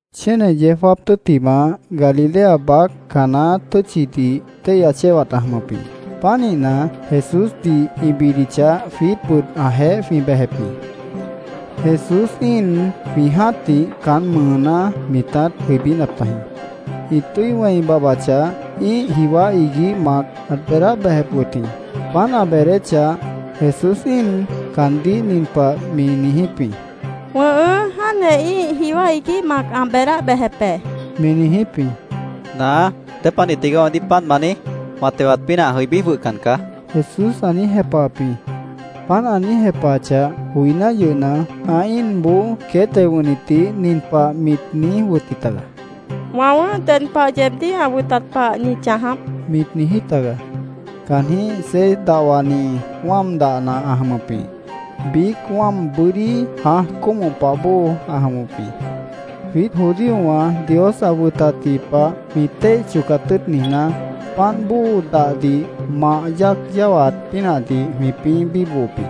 Chéne yeó jáap tʉ́ttimah, Galilea baác Caná tʉ́tchidih, téihya chéwat ã jʉmʉp jĩ. Pánihna, Jesúsdih ĩ bidichah, jwiítbʉt ãjeéh jwĩ bejep jĩ. Jesús íin jwĩ jã́tih caán mʉʉná mitát jʉibínap tajĩ. Ĩ tʉ́i wẽi babhbachah, ĩ́ih jiwá iguíh mac ãt beedáh bejep wʉt jĩ. Páant ã beedéchah, Jesús íin caandíh nin pah mi niijíp jĩ: —Wʉ̃ʉhʉ́, jáantjeh ĩ́ih jiwá iguíh mac ã beedáh bejep be, mi niijíp jĩ. —Naá, ¿dépanih tigaá weemdíh páant ma niíj? Wã tewat pínah ã jʉibí jwʉhna caá, Jesús ã niíj jepahap jĩ. Páant ã niíj jepahachah joiná yʉhna, ã íinboó queét teo wʉ̃hnitdih nin pah mit niíj wʉtji taga: —Wã wʉ̃ʉ́h ded pah yeebdíh ã wʉtat pah ñi chãjáp, mit niijí taga. Caanjĩ́h seis dahwani wáam dahna ã jʉmʉp jĩ. Biíc wáam bʉ́dí jãaj cómoh pah bóo ã jʉmʉp jĩ. Jwiít judíowã Dios ã wʉtatji pah jwĩ téih chocat tʉ́ʉt niijná, páant bóo dahdih mah yáac yáwaat pínahdih jwĩpĩ́ bíbohop jĩ.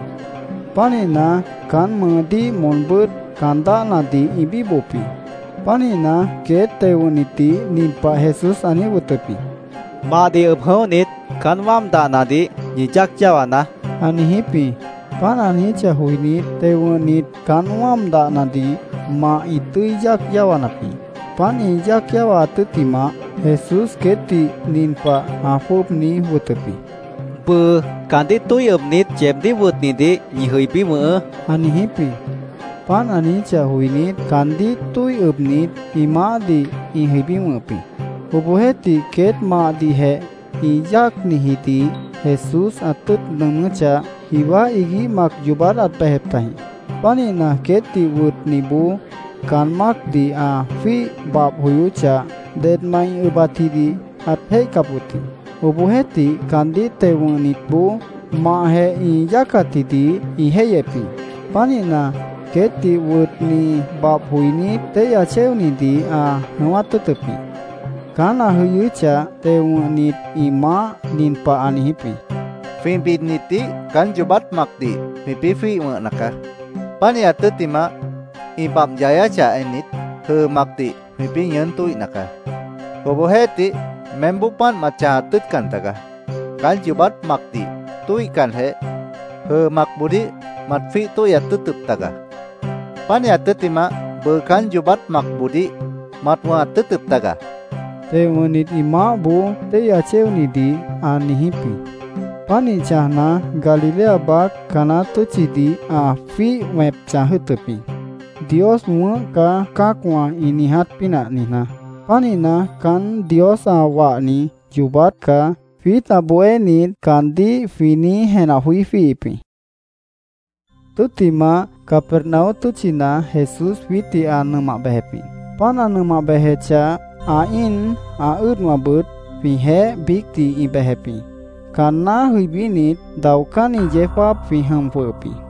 Pánihna, caán mʉʉdíh moonbʉ́t caan dáhnadih ĩ bíbohop jĩ. Pánihna, queét teo wʉ̃hnitdih nin pah Jesús ã niíj wʉtʉp jĩ: —Mahdih ʉb jʉ̃óhnit, caán wáam dahnadih ñi yáac yáwanaá, ã niijíp jĩ. Páant ã niijíchah joinít, teo wʉ̃hnit caán wáam dahnadih mah ĩ tʉ́i yáac yáwanap jĩ. Páant ĩ yáac yáwaat tʉ́ttimah, Jesús queétdih nin pah ã jwʉ́ʉb niíj wʉtʉp jĩ: —Bʉʉ caandíh tóih ʉbnit, yeebdíh wʉtnidih ñi jʉibí wʉ̃hʉʉ́, ã niijíp jĩ. Páant ã niijíchah joinít, caandíh tóih ʉbnit, ĩ maáhdih ĩ jʉibí wʉ̃hʉp jĩ. Obohjeéhtih, queét mahdihjeh ĩ yáacnijidih Jesús ã tʉ́ʉt nʉʉmʉ́chah, jiwá iguíh mac yoobát ãt bejep tajĩ. Pánihna, queétdih wʉtniboó caan mácdih ã jwíih babh joyóchah, dedmant ĩ ʉbatjidih ãt jéihcap wʉt jĩ. Obohjeéhtih, caandíh teo wʉ̃hnitboó mahjeh ĩ yáacatjidih ĩ jéihyep jĩ. Pánihna, queétdih wʉtni babh joinít, téihya chéonidih ã jʉ̃ʉ́wát tʉ́ʉtʉp jĩ. Caán ã jʉyʉ́chah, teo wʉ̃hnit ĩ maáh nin pah ã niijíp jĩ: —Jwĩ bidnitdih caán yoobát macdih jwĩpĩ́ jwíih wʉ̃hna caá. Pánihat tʉ́ttimah, ĩ babh yáwachah ennit, jʉʉ macdih jwĩpĩ́ ñʉʉ́n tóihna caá. Obohjeéhtih meémboó páant mat chãjat tʉ́ʉtcan tagaá. Caán yoobát macdih tóihcanjeh, jʉʉ macboodíh mat jwíih tóihyat tʉ́ʉtʉp taga. Pánihat tʉ́ttimah, bʉʉ caán yoobát macboodíh mat wʉ̃hat tʉ́ʉtʉp taga, teo wʉ̃hnit ĩ maáhboó téihya chéonidih ã niijíp jĩ. Pánih chãjna, Galilea baác Caná tʉ́tchidih ã jwíih wẽp chãj jʉ́ʉtʉp jĩ, “Dios wʉ̃ʉ́h caá”, cã́acwã ĩ niiját pínah niijná. Pánihna, “Caán Dios ã wahni yoobát caá”, jwiít ã bohénit caandíh jwĩ niíj jenah joí jwíihip jĩ. Tʉ́ttimah, Capernaum tʉ́tchina Jesús jwiítdih ã nʉmah bejep jĩ. Páant ã nʉmah bejechah, ã íin, ã ʉ́ʉdwãbʉt jwĩjeéh biícdih ĩ bejep jĩ. Caanná jʉibínit, daocánni yeó jáap jwĩ jʉm jwʉhʉp jĩ.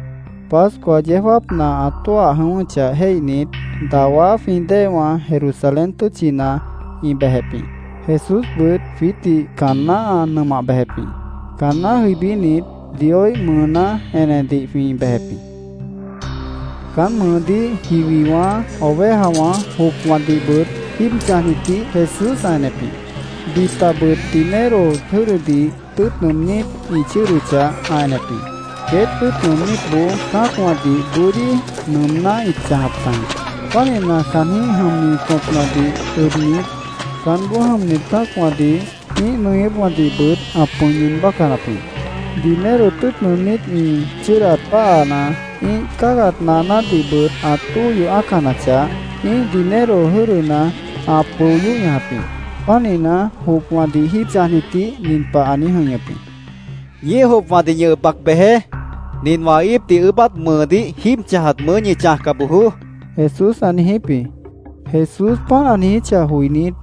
Pascua yeó jáapna ã tóah jʉ̃ʉ́wʉ́chah jéihnit, dawá jwĩ déewã Jerusalén tʉ́tchina ĩ bejep jĩ. Jesúsbʉt jwiítdih caanná ã nʉmah bejep jĩ. Caanná jʉibínit, Dioíh mʉʉná enedih jwĩ bejep jĩ. Caán mʉʉdíh jiwiwã, ovejawã, jopwãdihbʉt jíib chãjnitdih Jesús ã enep jĩ. Bitabʉt dinero jʉ́dʉdih tʉ́ʉt nʉʉmnít ĩ chʉ́ʉdʉchah, ã enep jĩ. Queét tʉ́ʉt nʉʉmnítboó cã́acwãdih bʉ́dí nʉʉmná ĩt chãjap tajĩ. Pánihna, caanjĩ́h jʉmni tõpnadih ʉbnit, caánboó jʉmnit cã́acwãdih ĩ́ih nʉñʉ́pwãdihbʉt ã pʉ̃i ñʉʉn bácanap jĩ. Dinero tʉ́ʉt nʉʉmnít ĩ chʉ́ʉdat páhana, ĩ́ih cáagat naanádihbʉt ã tóo yoh ã́acanachah, ĩ́ih dinero jʉ́dʉna ã pʉo yóh ñajap jĩ. Pánihna, jopwãdih jíib chãjnitdih nin pah ã niíj jʉ̃ihñʉp jĩ: —Ñíih jopwãdih ñi ʉb bac bejeé. Nin wã íipdih ʉʉ́bát mʉʉdíh jíib chãjat mʉʉ́ ñi chãjca bojoó, Jesús ã niijíp jĩ. Jesús páant ã niijíchah joinít,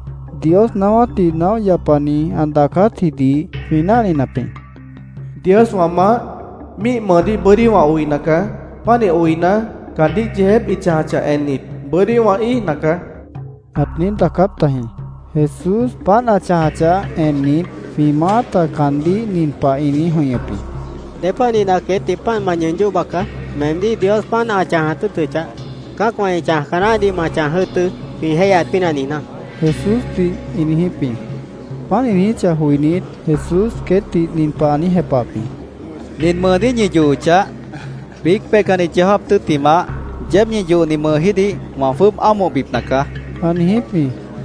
Dios naáwátdih naóh yapani ã daacátjidih jwĩ náhninap jĩ. “Dios wã Maáh, míih mʉʉdíh bʉ́dí wã oina caá. Pánih oina, caandíh yeejép ĩ chãjachah ennit, bʉ́dí wã íijna caá”, ãt niíj daacáp tajĩ. Jesús páant ã chãjachah ennit, jwĩ maáta caandíh nin pah ĩ niíj jʉ̃ihñʉp jĩ: —¿Dépanihna queétdih páant ma ñʉʉn yóh baca? Meemdíh Dios páant ã chãjat tʉ́ʉtʉchah, cã́acwã ĩ chãjca naáhdih ma chãj jʉ́ʉtʉ́, jwĩ jéihyat pínah niijná, Jesúsdih ĩ niijíp jĩ. Páant ĩ niijíchah joinít, Jesús queétdih nin pah ã niíj jepahap jĩ: —Nin mʉʉdíh ñi yohochah, biíc peihcanni yeó jáap tʉ́ttimah, yeéb ñi yohni mʉʉjídih wã jwʉ́ʉb ámohbipna caá, ã niijíp jĩ.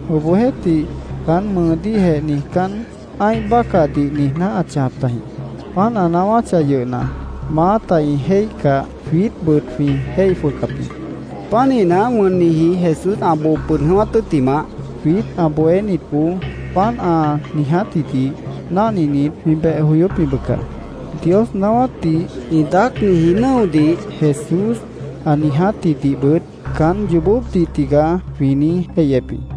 Obohjeéhtih, caán mʉʉdíhjeh niijcán, ã́ih bácahdih niijná ãt chãjap tajĩ. Páant ã naáwáchah yʉhna, maáta ĩ jéihcah, jwiítbʉt jwĩ jéih jwʉhcap jĩ. Pánihna, wʉnniji Jesús ã boo pʉd jʉ̃ʉ́wát tʉ́ttimah, jwiít ã bohénitboó páant ã niijátjidih náhninit, jwĩ beh joyóp jĩ, bʉca. Dios naáwátdih ĩ daácniji nʉ́odih, Jesús ã niijátjidihbʉt “Caán yoobópdih tigaá”, jwĩ niíj jéihyep jĩ.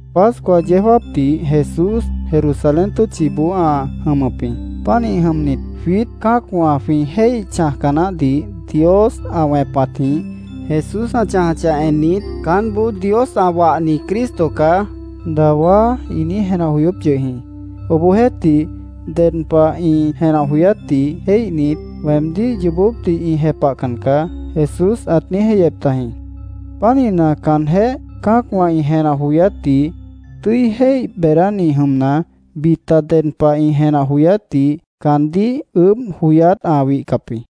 Pascua yeó jáapdih Jesús Jerusalén tʉ́tchiboó ã jʉmʉp jĩ. Pánih jʉmnit, jwiít cã́acwã jwĩ jéih chãjca naáhdih Dios ã wẽpatjĩh Jesús ã chãjachah ennit, “Caánboó Dios ã wahni Cristo caá”, dawá ĩ niíj jenah joyóp yʉh jĩ. Obohjeéhtih, ded pah ĩ jenah joyátdih jéihnit, “Weemdíh yoobópdih ĩ jepahcan caá”, Jesús ãt niíj jéihyep tajĩ. Pánihna, caanjéh cã́acwã ĩ jenah joyátdih tʉ́i jéih beedáni jʉmna, bita ded pah ĩ jenah joyátdih caandíh ʉʉ́bh joyát ã wihcap jĩ.